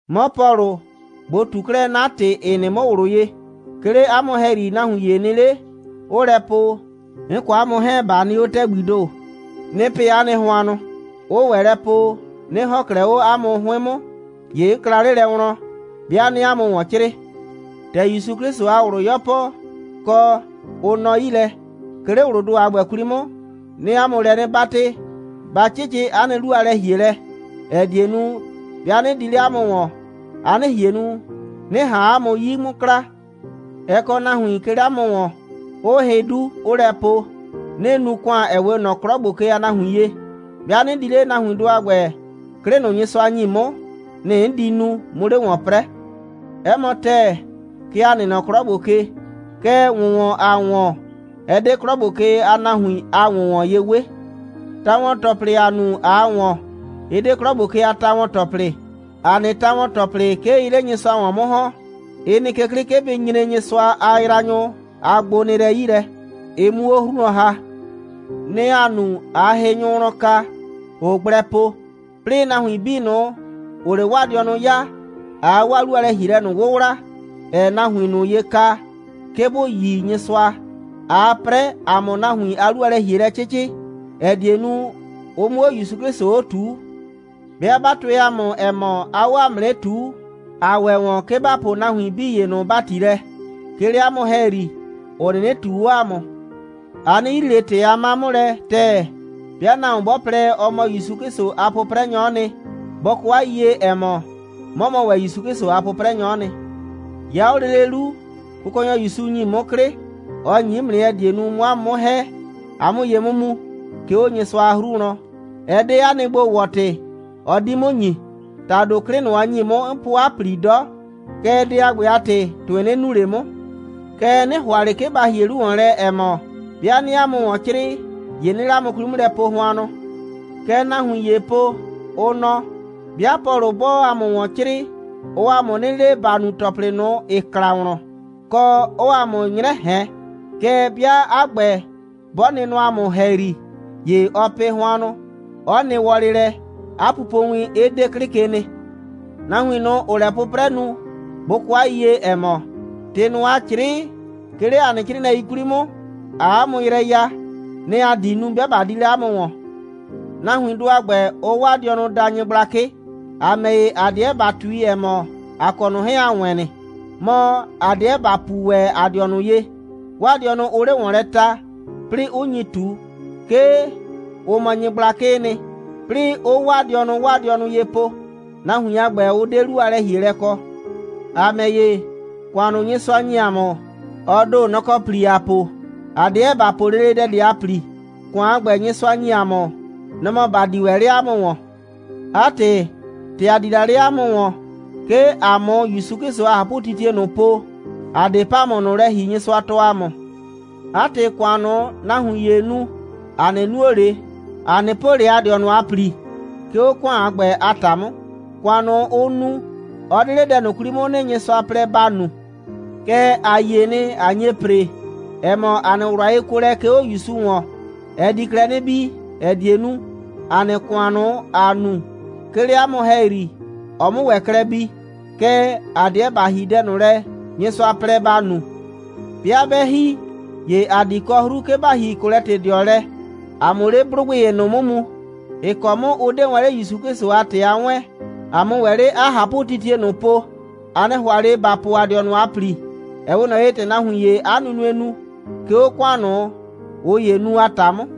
'Mɔ Pɔlʋ, ꞊bo ꞊tu 'klɛɛ 'na ‑tɩ, ‑ɩ nɩ 'mʋ ꞊wlʋ ye. 'Ke 'le 'a mʋ ‑hɛyri, nahuin ‑ye nɩ 'le, 'ʋʋ lɛ po, 'n kɔ 'a mʋ 'hɛɛn, ꞊ba nɩ 'o ‑tɛgbii ‑do, 'nɩɩ pɩ 'a nɩ hʋannʋ, 'ʋʋ ‑wɛ lɛ po, 'nɩ ‑hɔn 'klɛɛ 'o 'a mʋ 'hʋɩn 'mʋ, ‑ye 'n kla 'le lɛ wlɔn, 'bɩa 'nɩɩ 'a mʋ ‑wɔn 'crɩɩ. ‑Tɛ ‑Yusu 'Klɩsʋ a ꞊wlʋ 'yɔpɔ, kɔ, ʋ nɔ 'yi lɛ, 'ke 'le ꞊wlʋʋ ‑do a ‑gbɛ 'kwli 'mʋ, 'nɩɩ 'a mʋ lɛ 'nɩ 'batɩ, ba 'cɩcɩ 'a nɩ 'lu a lɛ‑hielɛ, ‑ɛ die nu, 'bɩa 'nɩ di 'le 'a mʋ ‑wɔn, a 'nɩ ꞊hien nu, 'nɩ ꞊han 'a mʋ 'yi 'mʋ kla. Ɛ kɔ nahuin, 'ke 'le 'a mʋ ‑wɔn, 'ʋʋ hɩ 'du, 'ʋʋ lɛ po, 'nɩɩ nu ‑kʋan, ‑ɛ 'we ꞊nɔ 'klɔ ‑gbo ke a nahuin ye. 'Bɩa 'nɩ di 'le, nahuindʋ a ‑gbɛ, 'klɩ ꞊nʋ, Nyɩsʋa ‑nyi 'mʋ, nɩ‑ 'n di nu, 'mu 'le ‑wɔn 'prɛɛ. 'Ɛ mɔ ‑tɛɛ, kɛ ‑a nɩ nɔ 'klɔ ‑gbo ke. Kɛɛ, ‑wʋnwɔn, ‑aa ‑wɔn, ɛ 'de 'klɔ ‑gbo ke a nahuin a ‑wʋnwɔn ye 'we. Ta‑wɔn‑tɔplɩ, ‑aa nu, ꞊aa ‑wɔn, ɩ 'de 'klɔ ‑gbo ke a ta‑wɔn‑tɔplɩ. ‑A nɩ ta‑wɔn‑tɔplɩ, 'ke ɩɩ 'le Nyɩsʋa ‑wɔn 'mʋ ‑hɔn. Ɩ nɩ ke 'klɩ, 'ke bɩ nyre Nyɩsʋa a yraanyʋ a gbonɩɩlɛi 'yi lɛ, ɩ 'mu 'o 'hru wlɔn ‑ha. Nɩ‑ ‑aa nu, ꞊aa hɩnyʋ wlɔn ka, ‑ʋʋ gblɛ po, 'plɩɩ nahuin 'bii ꞊nʋ, ‑ʋʋ 'le 'waa dɩɔnʋ 'yaa, ꞊aa 'waa 'lu a lɛ‑hielɛ ꞊nʋ 'wʋwla, ‑ɛɛ nahuin ꞊nʋ ye ka, 'ke bʋ yi Nyɩsʋa, ꞊aa 'prɛ, ‑a 'mʋ nahuin a 'lu a lɛ‑hielɛ 'cɩcɩ, ‑ɛ die nu, ʋ 'mʋ 'o ‑Yusu 'Klɩsʋ 'o ꞊tuu. 'Bɩa 'ba tʋɛ ‑a mʋ, ‑ɛ mɔ, aa 'o ‑a mʋ 'nɩ ꞊tuu, ‑a ‑wɛ ‑wɔn, 'ke ‑ba poo nahuin 'bii ‑ye ꞊nʋ ‑bati lɛ, 'ke 'le 'a mʋ ‑hɛyri, ‑ʋ 'nɩnɩ ꞊tuu 'o ‑a mʋ. A 'nɩ yrii ꞊le ‑tɩ a 'ma 'mʋ lɛ ‑tɛɛ. 'Bɩa nahuon 'bɔ plɛ, ɔ mɔ ‑Yusu 'Klɩsʋ a 'pʋprɛnyɔ'ɔ nɩ, bɔ kɔ 'a yiyie, ‑ɛ mɔ, 'mɔ mɔ ‑wɛ ‑Yusu 'Klɩsʋ a 'pʋprɛnyɔ'ɔ nɩ. 'Ya 'o lele 'lu, Kʋkɔnyɔ ‑Yusu ‑nyi 'mʋ 'klɩ. Ɔ ‑nyi 'mʋ nɩ, ‑ɛ die nu, 'mʋ 'a mʋ 'mʋ ‑hɛ, a 'mʋ ye 'mʋ mu, 'ke 'o Nyɩsʋa a 'hru wlɔn. Ɛ 'de 'a nɩ gbo‑wɔ‑tɩ, ɔ 'di 'mʋ ‑nyi. ‑Tado 'klɩ ꞊nʋ, ɔ ‑nyi 'mʋ, 'n po 'a ‑pli 'dɔ. Kɛɛ, dɛ a ‑gbɛ a ‑tɩ, ‑tʋɩ 'nɩ nu ꞊le 'mʋ. Kɛɛ, 'nɩ ‑hʋa ꞊le 'ke ba ‑hie 'lu ‑wɔn lɛ, ‑ɛ mɔ, 'bɩa 'nɩɩ 'a mʋ ‑wɔn 'crɩɩ, ‑ye 'nɩɩ 'le 'a mʋ 'kwli 'mʋ lɛ po hʋannʋ. Kɛ nahuin ‑yee po, ʋ nɔ: «'Bɩa Pɔlʋ 'bɔɔ ‑a mʋ ‑wɔn 'crɩɩ, ɔɔ ‑a mʋ 'nɩ le, ‑ba nu ‑tɔplɩ ꞊nʋ, ‑ɩ kla wlɔn, kɔ, 'ɔɔ ‑a mʋ 'nyrɛ ꞊hɛn. Kɛɛ, 'bɩa 'a ‑gbɛ, 'bɔ nɩ nɔ ‑a mʋ ‑hɛyri, ‑ye ɔɔ pɩ hʋannʋ, 'ɔ nɩ wɔlɩ lɛ, 'a pupowin 'ɩ 'de 'klɩ ke nɩ.» Nahuin ꞊nʋ, ‑ʋʋ lɛ 'pʋprɛ nu, bʋ kɔ 'a yiyie, ‑ɛ mɔ, ‑tɩ ꞊nʋ, ‑aa 'crɩɩ, 'ke 'le ‑a nɩ 'crɩɩnɩɛi 'kwli 'mʋ, ‑aa 'a mʋ yrɛ ya, nɩ‑ ‑a di nu, 'bɩa ꞊ba di 'le 'a mʋ ‑wɔn. Nahuindʋ a ‑gbɛ, ʋʋ 'waa dɩɔnʋ daa nyɩgblakɩ. ‑A ‑mɛ ‑ye, ‑a 'deɛ ‑ba ꞊tui, ‑ɛ mɔ, ‑a kɔ ꞊nʋ 'hɛɛn, ‑a wɛɛn nɩ, mɔ, ‑a 'deɛ ‑ba puu ‑wɛ ‑a dɩɔnʋ ye. 'Waa dɩɔnʋ ʋʋ 'le ‑wɔn lɛ ta, 'plɩɩ 'ʋ nyi ꞊tu, 'ke ʋ mɔ nyɩgblakɩɩ nɩ, 'plɩɩ 'ʋʋ 'waa dɩɔnʋ 'waa dɩɔnʋ ye poo. Nahuin a ‑gbɛ, ʋ 'de 'lu a lɛ‑hielɛ kɔ. ‑A ‑mɛ ‑ye, ‑kʋan ꞊nʋ, Nyɩsʋa ‑nyi ‑a mʋ, ɔ ‑do, nɔ‑ kɔ ‑pli ‑aa po. ‑A 'deɛ ‑ba po lele dɛ ꞊de a ‑pli. ‑Kʋan a ‑gbɛ, Nyɩsʋa ‑nyi ‑a mʋ, nɔ‑ mɔ ‑ba di ‑wɛ 'le 'a mʋ ‑wɔn. 'A ‑tɩ, ‑tɛ ‑a di la 'le 'a mʋ ‑wɔn, 'ke ‑a 'mʋ ‑Yusu 'Klɩsʋ a ꞊hapʋtitie ꞊nʋ po, ‑a 'de ‑pamʋ ꞊nʋ lɛ ‑hi, Nyɩsʋa tɔɔ ‑a mʋ. 'A ‑tɩ, ‑kʋan ꞊nʋ, nahuin ‑yee nu, ‑a 'nɩ nuo ꞊le, ‑a 'nɩ po ꞊le ‑a dɩɔnʋ a ‑pli, 'ke 'o ‑kʋan a ‑gbɛ a ta 'mʋ. ‑Kʋan ꞊nʋ, ʋʋ nu, ɔ 'de 'le dɛ ꞊nʋ 'kwli 'mʋ nɩ, Nyɩsʋa plɛ ‑ba nu. Kɛɛ, ‑a yie nɩ, ꞊a nye ‑pre, ‑ɛ mɔ, 'a nɩ ꞊wlʋ a yekuolɛ, 'ke 'o ‑Yusu ‑wɔn, ɛ di klɛ 'nɩ bii, ‑ɛ die nu, ‑a nɩ ‑kʋan ꞊nʋ, ‑aa nu, 'ke 'le 'a mʋ ‑hɛyri, ɔ 'mʋ ‑wɛ klɛ bii. Kɛɛ, ‑a 'deɛ ‑ba ‑hi dɛ ꞊nʋ lɛ, Nyɩsʋa plɛ ‑ba nu. 'Bɩa 'bɛ ‑hi, ‑ye ‑a di kɔ 'hru, 'ke ‑ba ‑hi Kolɛtɩdɩɔ lɛ, ‑a 'mʋ 'le 'blʋgbɩ ‑ye ꞊nʋ 'mʋ mu, ‑ɩ kɔ 'mʋ ʋ 'de wɛn 'le ‑Yusu 'Klɩsʋ a ‑tɩ a 'wɛɛn, ‑a 'mʋ ‑wɛ 'le 'a ꞊hapʋtitie ꞊nʋ po. ‑A 'nɩ ‑hʋa ꞊le ‑ba po ‑a dɩɔnʋ a ‑pli, ‑ɛ 'we ꞊nɔ ye, ‑tɛ nahuin ‑yee 'a nunue nu, 'ke 'o ‑kʋan ꞊nʋ, ꞊ʋ ‑yee nu a ‑ta 'mʋ.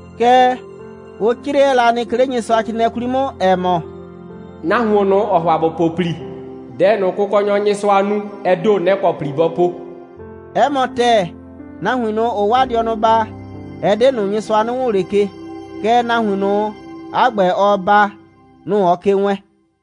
Kɛɛ, ʋ 'crɛɛ la nɩ, 'ke 'le Nyɩsʋacrɩɩnɩɛ 'kwli 'mʋ, ‑ɛ mɔ: «Nahuon ꞊nʋ, ‑ɔɔ ‑hʋa ‑bɔ po ‑pli, dɛ ꞊nʋ, Kʋkɔnyɔ Nyɩsʋa nu, ɛ ‑do, nɛ‑ kɔ ‑pli bɔ po.» 'Ɛ mɔ ‑tɛɛ, nahuin ꞊nʋ, ‑ʋʋ 'waa dɩɔnʋ baa, ɛ 'de ꞊nʋ, Nyɩsʋa 'nɩ wʋʋn ꞊le ke, kɛɛ, nahuin ꞊nʋ, 'a ‑gbɛ, ɔɔ baa, nʋ‑ ɔɔ ke wɛɛn.